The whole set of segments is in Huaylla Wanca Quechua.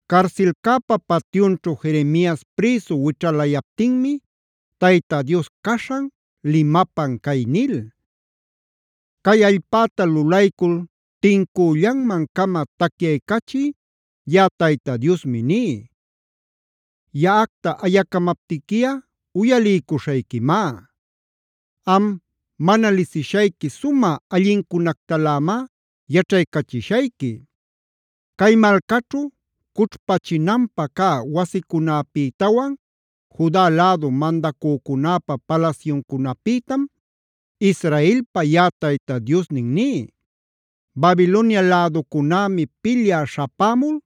Carsilcäpa patyunćhu Jeremias prïsu wićhalayaptinmi Tayta Dios caśhan limapan cay nil: “Cay allpäta lulaycul tincüllanman-cama tacyaycachï yaꞌa Tayta Diosmi ní: Yaꞌacta ayacamaptiquiꞌa uyaliycuśhayquimá. Am, mana lisishayqui sumä allincunactalämá yaćhaycachishayqui. Cay malcaćhu cućhpachinanpä cä wasicunapïtawan Juda lädu mandacücunäpa palasyuncunapïtam Israelpa yaꞌa Tayta Diosnin ní: Babilonia läducunämi pilyä śhapämul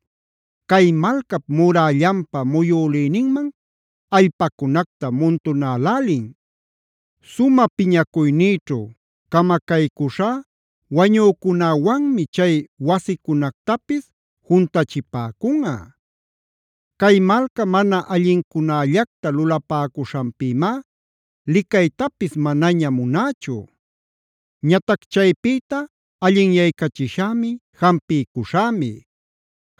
cay malcap murällanpa muyülïninman allpacunacta muntunälälin. Sumä piñacuynïćhu camacaycuśhá wañücunäwanmi chay wasicunactapis juntachipäcunꞌa. Cay malca mana allincunällacta lulapäcuśhanpïmá licaytapis manaña munächu. “Ñatac chaypïta allinyaycachishämi, jampiycuśhämi.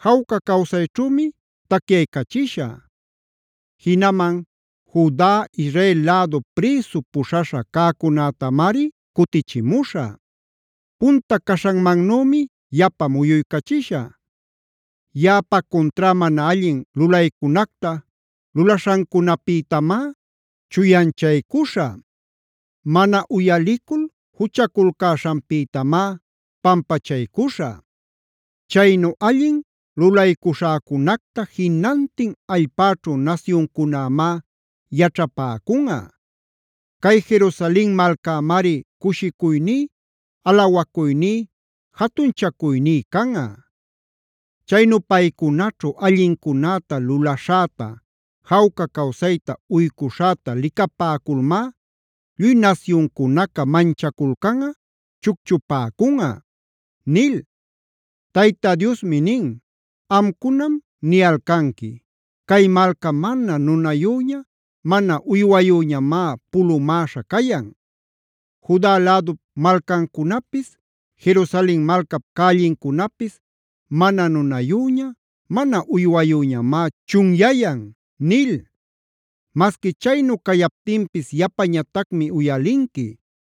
Jawca cawsayćhümi tacyaycachishä. Jinaman Juda, Israel lädu prïsu puśhaśha cäcunätamari cutichimuśhä. Punta caśhanmannümi yapa muyuycachishä. Yaꞌapa cuntrá mana allin lulaycunacta lulaśhancunapïtamá chuyanchaycuśhä. Mana uyalicul juchaculcäśhanpïtamá pampachaycuśhä. Chaynu allin lulaycuśhäcunacta jinantin allpäćhu nasyuncunämá yaćhapäcunꞌa. Cay Jerusalen malcämari cushicuyní, alawacuyní, jatunchacuyní canꞌa. Chaynu paycunaćhu allincunäta lulaśhäta, jawca cawsayta uycuśhäta licapäculmá lluy nasyuncunaca manchaculcanꞌa, chucchupäcunꞌa” nil. Tayta Diosmi nin: “Amcunam niyalcanqui: ‘Cay malca mana nunayüña, mana uywayüñamá pulumäśha cayan. Juda lädup malcancunapis, Jerusalen malcap cällincunapis mana nunayüña, mana uywayüñamá chunyayan’ nil. Masqui chaynu cayaptinpis yapañatacmi uyalinqui,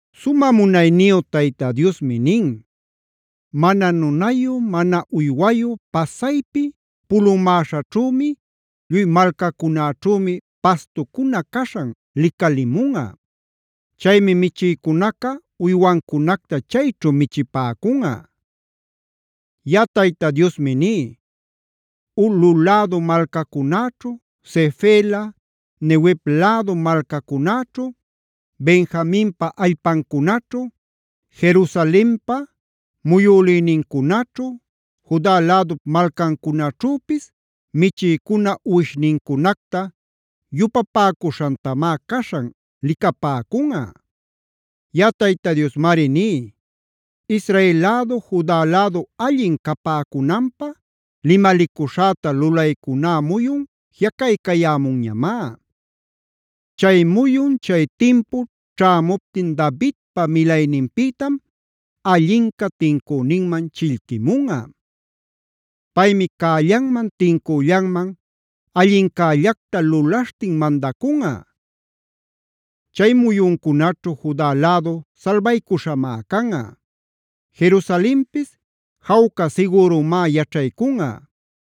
Sumä munayniyu Tayta Diosmi nin: “Mana nunayu, mana uywayu pasaypi pulumäśhäćhümi, lluy malcacunäćhümi pastucuna caśhan licalimunꞌa. Chaymi michïcunaca uywancunacta chayćhu michipäcunꞌa. Yaꞌa Tayta Diosmi ní: Ulꞌu lädu malcacunäćhu, Sefela, Neguev lädu malcacunäćhu, Benjaminpa allpancunaćhu, Jerusalenpa muyülïnincunaćhu, Juda lädup malcancunaćhüpis michïcuna uwishnincunacta yupapäcuśhantamá caśhan licapäcunꞌa. “Yaꞌa Tayta Diosmari ní: Israel lädu, Juda lädu allin capäcunanpä limalicuśhäta lulaycuná muyun jiꞌacaycayämunñamá. Chay muyun, chay timpu ćhämuptin Davidpa milayninpïtam Allinca tincüninman chillquimunꞌa. Paymi cällanman, tincüllanman allincällacta lulaśhtin mandacunꞌa. Chay muyuncunaćhu Juda lädu salbaycuśhamá canꞌa; Jerusalenpis jawca sigürumá yaćhaycunꞌa.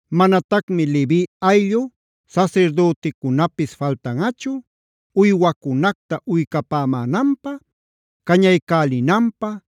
Manatacmi levi ayllu sasirdüticunapis faltanꞌachu, uywacunacta uycapämänanpä, cañaycälinanpä,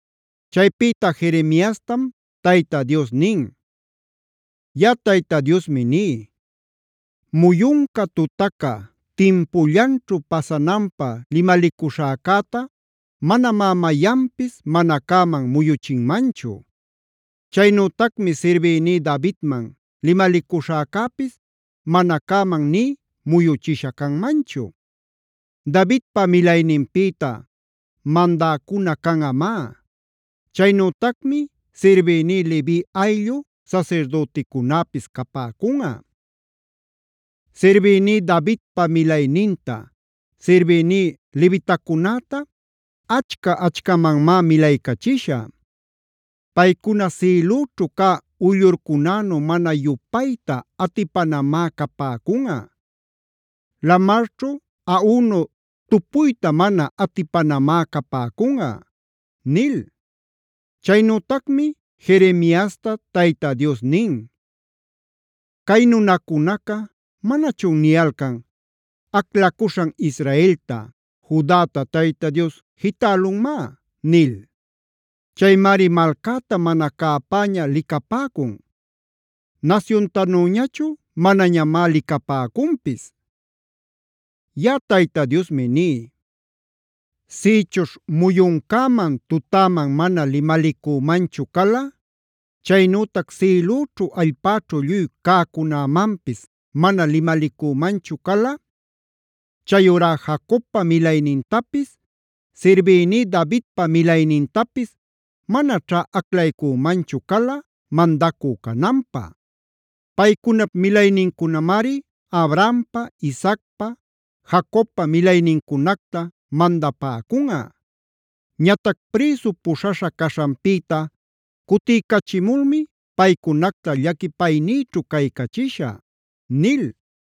Chaypïta Jeremiastam Tayta Dios nin: “Yaꞌa Tayta Diosmi ní: Muyunca, tutaca timpullanćhu pasananpä limalicuśhäcäta manamá mayanpis mana cäman muyuchinmanchu. Chaynütacmi sirbïní Davidman limalicuśhäcäpis mana cäman nï muyuchisha canmanchu. Davidpa milayninpïta mandäcuna canꞌamá; chaynütacmi sirbïní levi ayllu sasirdüticunäpis capäcunꞌa. Sirbïní Davidpa milayninta, sirbïní levitacunäta achca-achcamanmá milaycachishä. Paycuna sïlüćhu cä uyllurcunänu mana yupayta atipanamá capäcunꞌa; lamarćhu aꞌunu tupuyta mana atipanamá capäcunꞌa” nil. Chaynütacmi Jeremiasta Tayta Dios nin: “Cay nunacunaca, ¿manachun niyalcan: ‘Aclacuśhan Israelta, Judata Tayta Dios jitälunmá’ nil? Chaymari malcäta mana cäpäña licapäcun; nasyuntanüñachu manañamá licapäcunpis. Yaꞌa Tayta Diosmi ní: Sïchuśh muyuncäman tutäman mana limalicümanchu cala, chaynütac sïlüćhu allpäćhu lluy cäcunämanpis mana limalicümanchu cala, chayurá Jacobpa milaynintapis, sirbïní Davidpa milaynintapis manaćhá aclaycümanchu cala mandacü cananpä. Paycunap milaynincunamari Abrahampa, Isaacpa, Jacobpa milaynincunacta mandapäcunꞌa. Ñatac prïsu puśhaśha caśhanpïta cutiycachimulmi paycunacta llaquipaynïćhu caycachishä” nil.